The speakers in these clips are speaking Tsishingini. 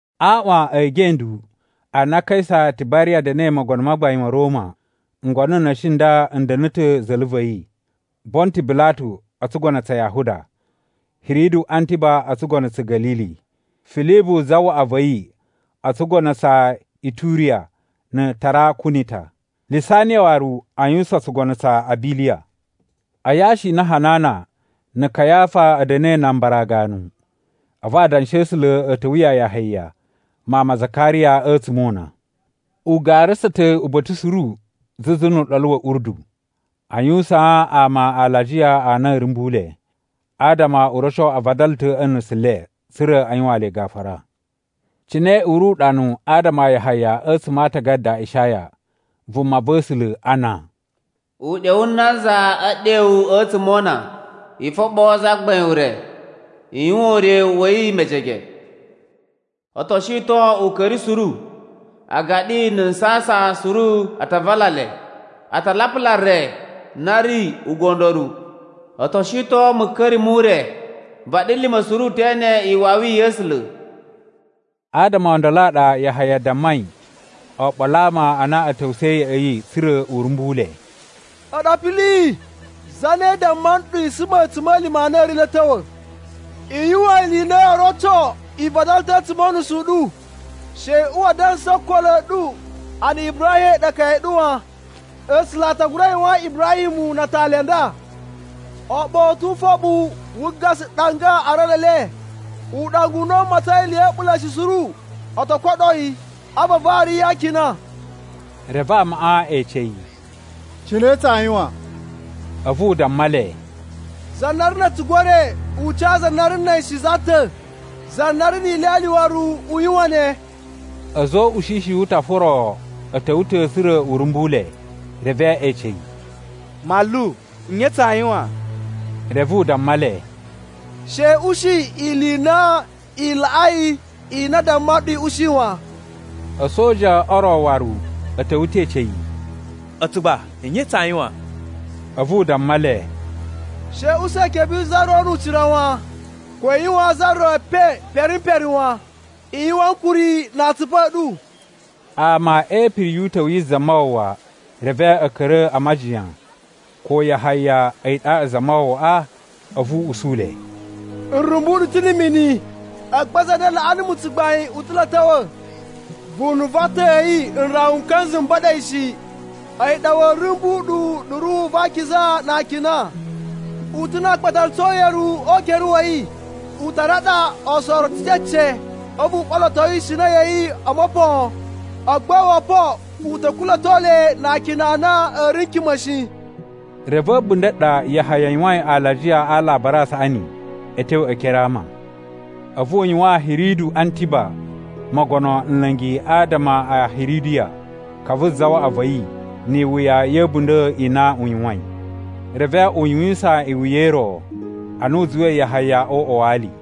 A aaꞌwan e gendu a na Kaisa Tibariya da̱na̱i mogono ma gbain ma̱ Roma, ngono n na̱shi n nda n da̱na̱ ta̱ za̱la̱ va̱ yi: Bontu Bilatu o tsugono tsa Yahuda, Hiridu Antiba o tsugono tsa̱ Ga̱lili, Filibu zawaꞌa va̱ yi o tsugono tsa Ituriya na̱ Tarakunita, Lisaniya waru a yuwusan tsugono tsa Abiliya. A yashi i na Hanana na̱ Kayafa a̱ da̱na̱i nan abara ganu, a̱vu adanshi a̱ A̱sula̱ a̱ ta̱wa̱ ya Yahaya mawun ma Zakariya a̱tsuma̱ o una. U garasa ta̱ uba̱ta̱ suru zuzu nu Uɗolu wa̱ Urdu, a yuwusaan ama alajiya a na a̱a̱ rumbu le, adama u roco a vadala ta̱ a̱ nusu le, tsa̱ra̱ a yuwaan le gafura. Cine u ri uɗanu adama a Yahaya a̱tsuma̱ a Aatagada a Ishaya, vumava̱sula̱, ana, “Uɗyo wu nanza e ɗewu a̱tsuma̱ o una, ‘I foɓoo Zagbain ure, i yuwan ure wa̱ yi mejege. O to shiton uka̱ri suru, agaɗi na̱ nsasan suru a ta vala le. A ta lapula re na ri ugondoru. O to shiton muka̱ri mu re. Vaɗilima̱ suru te ene iwawi ya̱ A̱sula̱.’” Adama o ndolo a ɗa Yahaya dammai oɓolo a ama a na a̱ ta̱wusa̱i ya̱ꞌa̱ yi, tsa̱ra̱ u rumbu le, “A̱ɗu apili! Zane damma nɗu i suma a̱tsuma̱lima̱ a na a̱ ri lo a̱ ta̱wa̱? I yuwan ili i na yoo roco i vadala ta̱ a̱tsuma̱ o unusu u ɗu. She i uwa a dansa o okolo a̱ ɗu a na Ibrahim a̱yi ɗa akaya a̱ ɗu wan. A̱sula̱ a ta gura yuwaan Ibrahim muwun na atali a nda. Aaɓau a̱ tu ufoɓu wu gasa ɗanga a aralu e le. Uɗanga u na u matsain ili ya̱ a̱ɓula̱ shi suru, o to koɗo yi, a̱vu a vari yi a akina.” Reve amaꞌa e ece yi, “Cine tsaa yuwan?” A̱vu u damma le, “Za na ri na̱ a̱tugu e re, u ca za na ri na̱ a̱yi shi za ta̱. Za na ri ni ilyalya waru u yuwan ne.” A̱za̱ o ushishi wu utafa o ro a̱ ta̱wa̱ ta̱, tsa̱ra̱ u rumbu le, reve e ece yi, “Manlu, nye tsaa yuwan?” Reve u damma le, “She i ushi ili i na i laꞌai ili i na a damma nɗu i ushi wan.” A̱soja o ro waru a̱ ta̱wa̱ ta̱ e ece yi, “A̱tsu gba, nye tsaa yuwan?” A̱vu u damma le, “She i usa ikebe yi za ro nu ucira wan, ko i yuwaan za ro epen pere m pere wan. I yuwan ankuri na atsupu a̱ ɗu.” Ama e ipiri yu uta̱wu yi Zamawawa, reve a̱ ka̱ra̱ a majiyan ko Yahaya a̱yi ɗaɗa Zamawawaꞌa. A̱vu u usu le, “N rumbu ɗu ta̱ na̱ mini, agba za na laꞌa numu tsugbain u ta̱ lo a̱ ta̱wa̱. Vunu va atan a̱ yi n rawa n ka̱nza̱ m ba̱ɗa̱ shi. A̱yi ɗa wa̱a̱ rumbu ɗu na̱ Ruhu va Akiza na akina. U ta̱ na aakpatalutsu o uyeluwu o ukere wa̱ yi, u ta raɗa oosoroto cece, a̱vu u ɓoloto ishina ya̱ yi o mopon, agba owopoꞌo u ta̱ kula̱to le na akina a na a̱ ri n kima̱ shi.” Re va̱ a̱bunda̱ ɗa Yahaya yuwain alajiya a Alabari a Saꞌani a̱ tyo e ekere a ama. A̱vu u yuwaan Hiridu Antiba mogono nla̱ngi adama a Hiridiya, ka vu zawaꞌa va̱ yi, ni iwuya ya̱ a̱bunda̱ i na u yuwain. Reve u yuwisan iwuya i ro, ana u zuwai Yahaya o uꞌwa wa ali.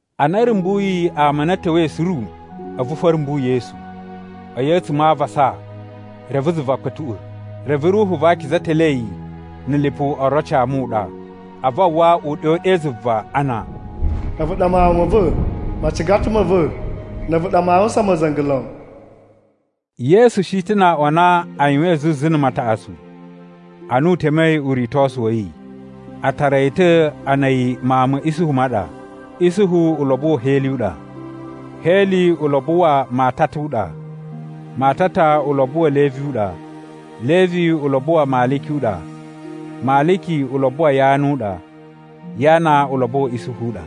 Ana a̱ rumbuyi ama a na a̱ ta̱wa̱i suru, a̱vu fo a̱ rumbu Yesu. A̱yi a̱tsuma̱ a avasa, reve zuva kpa̱tuꞌwa̱, reve Ruhu va Akiza telee yi na̱ lipu oroci a muɗa. A̱vu a uwwa uɗyo ɗe zuva ana, “A̱vu ɗa Mawun ma̱ va̱, macigata ma̱ va̱, na̱ a̱vu ɗa maa yuwusan ma̱za̱nga̱ lon.” Yesu shi ta̱ na aꞌwan a na a yuwain zuzu na̱ mataꞌatsu, ana u temei uritosu wa̱ yi. A tara yi ta̱ ana a̱yi mawun ma̱ Isuhu ma ɗa. Isuhu ulobo wa̱ Heli u ɗa. Heli ulobo wa Matata u ɗa. Matata ulobo wa̱ Levi u ɗa. Levi ulobo wa Maliki u ɗa. Maliki ulobo wa Yana u ɗa. Yana ulobo wa̱ Isuhu u ɗa.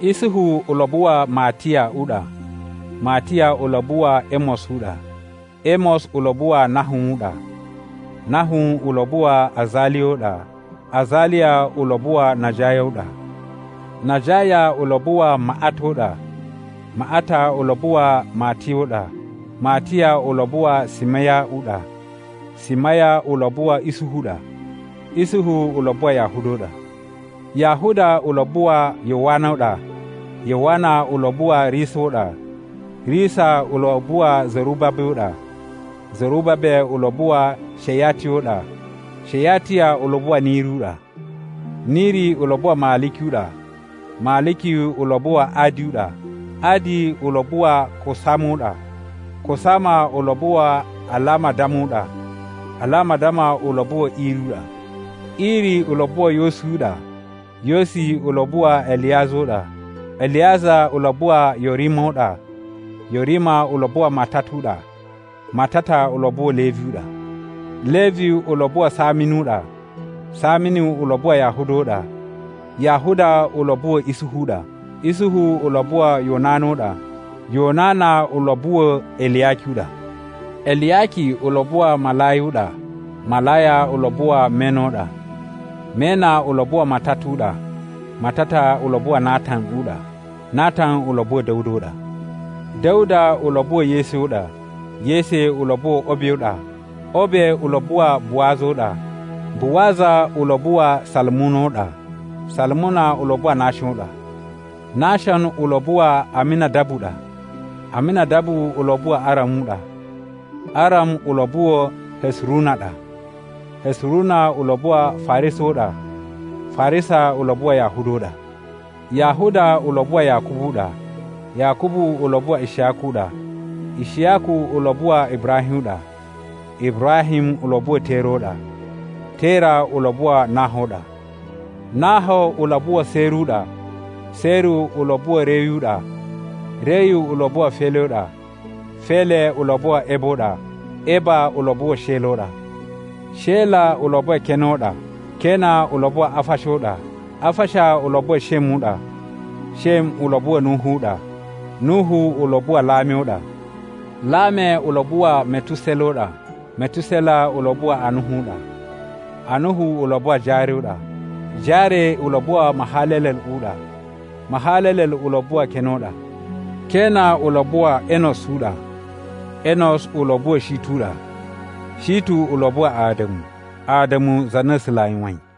Isuhu ulobo wa Matiya u ɗa. Matiya ulobo wa̱ Emos u ɗa. Emos ulobo wa Nahum u ɗa. Nahum ulobo wa Azaliya u ɗa. Azaliya ulobo wa Najaya u ɗa. Najaya ulobo wa Maꞌata u ɗa. Maꞌata ulobo wa Matiya u ɗa. Matiya ulobo wa Simiya u ɗa. Simiya ulobo wa̱ Isuhu u ɗa. Isuhu ulobo wa Yahuda u ɗa. Yahuda ulobo wa Yowana u ɗa. Yowana ulobo wa Risa u ɗa. Risa ulobo wa̱ Zerubabe u ɗa. Zerubabe ulobo wa Shayatiya u ɗa. Shayatiya ulobo wa̱ Niri u ɗa. Niri ulobo wa Maliki u ɗa. Maliki ulobo wa Adi u ɗa. Adi ulobo wa Kosama u ɗa. Kosama ulobo wa Alamadama u ɗa. Alamadama ulobo wa̱ Iri u ɗa. Iri ulobo wa̱ Yosi u ɗa. Yosi ulobo wa Eliyaza u ɗa. Eliyaza ulobo wa Yorima u ɗa. Yorima ulobo wa Matata u ɗa. Matata ulobo wa̱ Levi u ɗa. Levi ulobo wa Saminu u ɗa. Saminu ulobo wa Yahuda u ɗa. Yahuda ulobo wa̱ Isuhu u ɗa. Isuhu ulobo wa̱ Yonana u ɗa. Yonana ulobo wa̱ Eliyaki u ɗa. Eliyaki ulobo wa Malaya u ɗa. Malaya ulobo wa Mena u ɗa. Mena ulobo wa Matata u ɗa. Matata ulobo wa Natan u ɗa. Natan ulobo wa̱ Da̱wuda u ɗa. Da̱wuda ulobo wa̱ Yese u ɗa. Yese ulobo wa̱ Obe u ɗa. Obe ulobo wa Buwaza u ɗa. Buwaza ulobo wa Salumuna u ɗa. Salumuna ulobo wa Nashon u ɗa. Nashon ulobo wa Aminadabu u ɗa. Aminadabu ulobo wa Aram u ɗa. Aram ulobo wa̱ Hesuruna u ɗa. Hesuruna ulobo wa Farisa u ɗa. Farisa ulobo wa Yahuda u ɗa. Yahuda ulobo wa Yakubu u ɗa. Yakubu ulobo wa Ishiyaku u ɗa. Ishiyaku ulobo wa Ibrahim u ɗa. Ibrahim ulobo wa̱ Tera u ɗa. Tera ulobo wa Naho u ɗa. Naho ulobo wa̱ Seru u ɗa. Seru ulobo wa̱ Reyu u ɗa. Reyu ulobo wa̱ Fele u ɗa. Fele ulobo wa̱ Eba u ɗa. Eba ulobo wa̱ Shela u ɗa. Shela ulobo wa̱ Kena u ɗa. Kena ulobo wa Afasha u ɗa. Afasha ulobo wa̱ Shem u ɗa. Shem ulobo wa̱ Nuhu u ɗa. Nuhu ulobo wa Lame u ɗa. Lame ulobo wa̱ Metusela u ɗa. Metusela ulobo wa Anuhu u ɗa. Anuhu ulobo wa Jare u ɗa. Jare ulobo wa Mahalalel u ɗa. Mahalalel ulobo wa̱ Kena u ɗa. Kena ulobo wa̱ Enos u ɗa. Enos ulobo wa̱ Shitu u ɗa. Shitu ulobo wa Ada̱mu. Ada̱mu za na A̱sula̱ a yuwain.